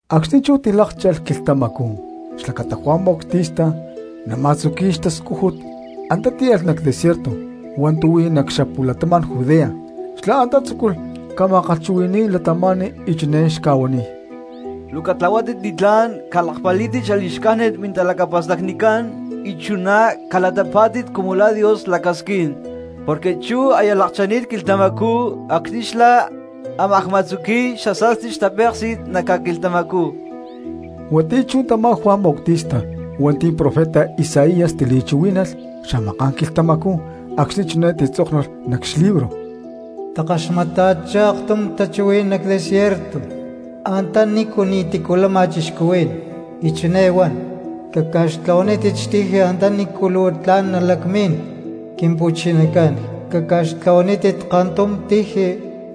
Acxni̠ chú tilákcha̠lh quilhtamacú xlacata Juan Bautista nama̠tzuqui̠y xtascújut, antá tíalh nac desierto hua̠ntu̠ huí nac xapu̠latama̠n Judea. Xlá antá tzúculh ca̠ma̠kalhchuhui̠ni̠y cristianos y chiné xca̠huaniy: —¡Luu catlahuátit li̠tlá̠n, calakpalí̠tit xali̠xcájnit mintalacapa̠stacnicán, y chuná calatapá̠tit cumu la̠ Dios lacasquín! Porque chú aya lakcha̠ni̠t quilhtamacú acxni̠ xlá ámaj ma̠tzuqui̠y xasa̠sti xtapéksi̠t nac ca̠quilhtamacú. Huatiyá chú tamá Juan Bautista hua̠nti̠ profeta Isaías tili̠chuhuí̠nalh xamaká̠n quilhtamacú acxni̠ chiné titzóknulh nac xlibro: Takaxmata̠chá aktum tachuhuí̠n nac desierto antanícu ni̠tícu lama cristianos y chiné huán: “Caca̠xtlahuanítit tiji antanícu luu tla̠n nalacmín Quimpu̠chinacán; caca̠xtlahuanítit kantum tiji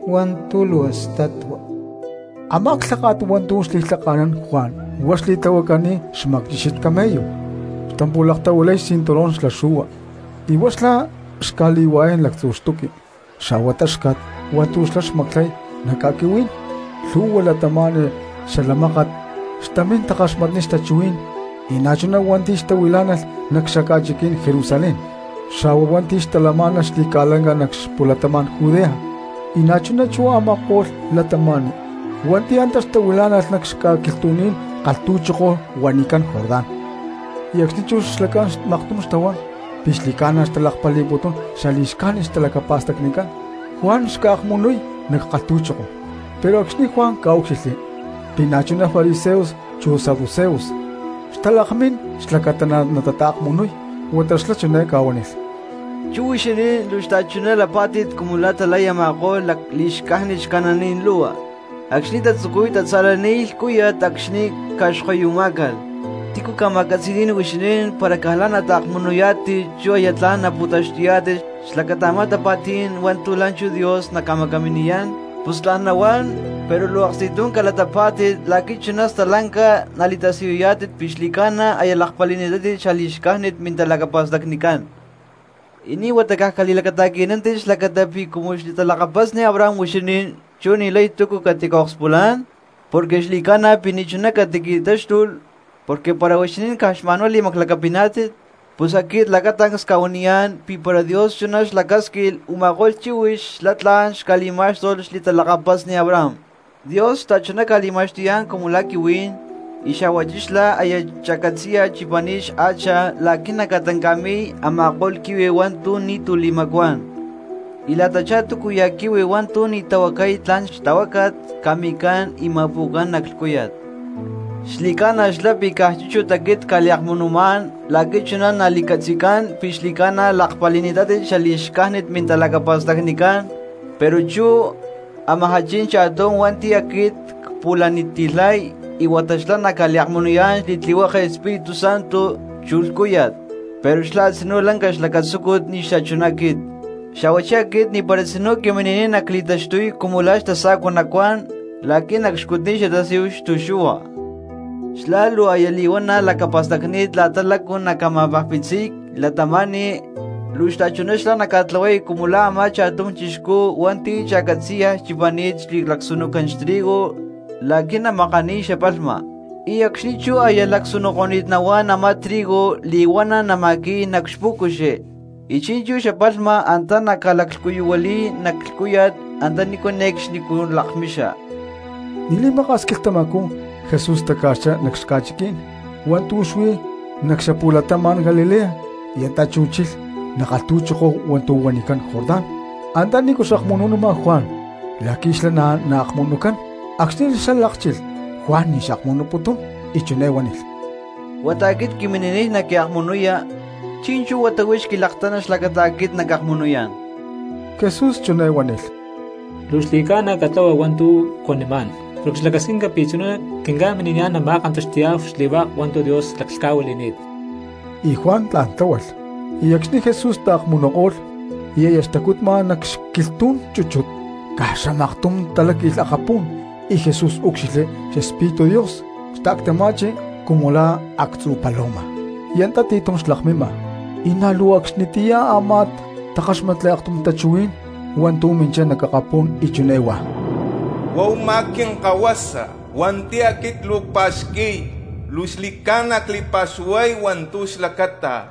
hua̠ntu̠ luu statua.” Amá lháka̠t hua̠ntu̠ xli̠lhaka̠nán Juan huá xli̠tlahuacani̠t xmacchíxit camello, xtampu̠laktahuilay kantum cinturón xla xu̠hua, y huá xlá xca̠li̠hua̠yán lactzu xtuqui xa̠hua táxca̠t hua̠ntu̠ xlá xmaclay nac ca̠quihuí̠n. Lhu̠hua cristianos xala mákat xtamín takaxmatniy xtachuhuí̠n, y na̠chuná hua̠nti̠ xtahuilá̠nalh nac xaca̠chiquí̠n Jerusalén, xa̠hua hua̠nti̠ xtalamá̠nalh xli̠ca̠lanca nac xapu̠latama̠n Judea y na̠chuná chú a̠ma̠ko̠lh cristianos hua̠nti̠ antá xtahuilá̠nalh nac xca̠quilhtu̠ní̠n kalhtu̠choko huanicán Jordán. Y acxni̠ chú xlacán maktum xtahuán pi̠ xli̠ca̠na xtalakpali̠putún xali̠xcájnit xtalacapa̠stacnicán, Juan xca̠akmunuy nac kalhtu̠choko. Pero acxni̠ Juan ca̠úcxilhli pi̠ na̠chuná fariseos chu saduceos xtalakmín xlacata na̠ natata̠kmunuy huata xlá chiné ca̠huánilh: —Chú huixinín luu xta̠chuná lapá̠tit cumu lá talay a̠ma̠ko̠lh lacli̠xcájnit xcananí̠n lu̠hua acxni̠ tatzucuy tatza̠laniy lhcúya̠t acxni̠ ca̠xkoyumá̠calh. ¿Tícu ca̠ma̠catzi̠ní̠n huixinín para caj la̠ nataakmunuyá̠tit chú aya tla̠n napu̠taxtuyá̠tit xlacata a̠má tapa̠tí̠n hua̠ntu̠ la̠nchú Dios naca̠macaminiyá̠n? Pus tla̠n nahuán, pero luu aksti̠tum calatapá̠tit la̠qui̠ chuná stalanca nali̠tasiyuyá̠tit pi̠ xli̠ca̠na aya lakpali̠ni̠tátit xali̠xcájnit mintalacapa̠stacnicán. Y ni̠ huata caj cali̠lacata̠qui̠nántit xlacata pi̠ cumu xli̠talakapasni Abraham huixinín chú ni̠lay túcu catica̠akspulán. Porque xli̠ca̠na pi̠ ni̠chuná catiqui̠táxtulh porque para huixinín caj xma̠nhuá li̠maclacapiná̠tit pus aquit lacatancs cca̠huaniyá̠n pi̠ para Dios chuná xlacásquilh u̠ma̠ko̠lh chíhuix xlá tla̠n xca̠li̠má̠xtulh xli̠talakapasni Abraham. Dios xta̠chuná ca̠li̠ma̠xtuyá̠n cumu la̠ quihuí̠n, y xa̠huachí xlá aya cha̠catzi̠yaj chipani̠t xhacha la̠qui̠ naca̠tanca̠mi̠y a̠ma̠ko̠lh quihui hua̠ntu̠ ni̠tu̠ li̠macuán. Y la̠tachá túcuya̠ quihui hua̠ntu̠ ni̠ tahuacay tlan xtahuácat ca̠mi̠cán y ma̠pu̠cán nac lhcúya̠t. Xli̠ca̠na xlá pi̠ caj chúchut aquit cca̠liakmunumá̠n la̠qui̠ chuná nali̠catzi̠cán pi̠ xli̠ca̠na lakpali̠ni̠tátit xali̠xcájnit mintalacapa̠stacnicán; pero chú amajá chin cha̠tum hua̠nti̠ aquit cpu̠laniti̠lhay huata xlá naca̠liakmunuyá̠n xli̠tlihueke Espíritu Santo chu lhcúya̠t. Pero xlá a̠tzinú lanca xlacatzúcut ni̠ xachuná aquit, xa̠huachí aquit ni̠para tzinú quimini̠niy nacli̠taxtuy cumu lá xtasa̠cua nacuán la̠qui̠ nacxcutniy xatasíhu xtu̠xu̠hua. Xlá luu aya li̠huana̠ lacapa̠stacni̠t la̠ta lácu naca̠ma̠pajpitziy cristianos, luu xta̠chuná xlá naca̠tlahuay cumu la̠ a̠má cha̠tum chixcú hua̠nti̠ cha̠catzi̠yaj chipani̠t xli̠lacsunucán xtrigo la̠qui̠ namakaniy xapalhma, y acxni̠ chú aya lacsunuko̠ni̠t nahuán a̠má trigo li̠huana̠ nama̠qui̠y nac xpú̠cuxi, y chi̠nchú xapalhma antá nalaclhcuyuhuili̠y nac lhcúya̠t antanícu ne̠cxnicú lakmixa. Ni̠ li̠maka̠s quilhtamacú Jesús taca̠xchá nac xca̠chiquí̠n hua̠ntu̠ huí nac xapu̠latama̠n Galilea y antá chú chilh nac kalhtu̠choko hua̠ntu̠ huanicán Jordán antanícu xakmunu̠numa Juan la̠qui̠ xlá na̠ naakmunucán. Acxni̠ xlá lákchilh, Juan ni̠ xakmunuputún, y chiné huánilh: —Huata aquit quimini̠niy naquiakmunuya, ¿chi̠nchú huata huix quilaktana xlacata aquit nacakmunuyá̠n? Jesús chiné huánilh: —Luu xli̠ca̠na catlahua hua̠ntu̠ cuanimá̠n porque xlacasquinca pi̠ chuná quinca̠mini̠niyá̠n nama̠kantaxti̠yá̠hu xli̠hua̠k hua̠ntu̠ Dios laclhca̠huili̠ni̠t. Y Juan tla̠n tláhualh. Acxni̠ Jesús taakmunuko̠lh y aya xtacutma nac xquilhtú̠n chúchut, ¡caj xamaktum taláqui̠lh akapú̠n y Jesús úcxilhli Xespíritu Dios xta̠ctama̠chi cumu la̠ actzu paloma y antá ti̠tum xlakmima! Y na̠ luu acxnitiyá a̠má takáxmatli aktum tachuhuí̠n hua̠ntu̠ minchá nac akapú̠n y chiné huá: —Huá u̠má Quinkahuasa hua̠nti̠ aquit luu cpa̠xqui̠y, luu xli̠ca̠na cli̠pa̠xuhuay hua̠ntu̠ xlacata.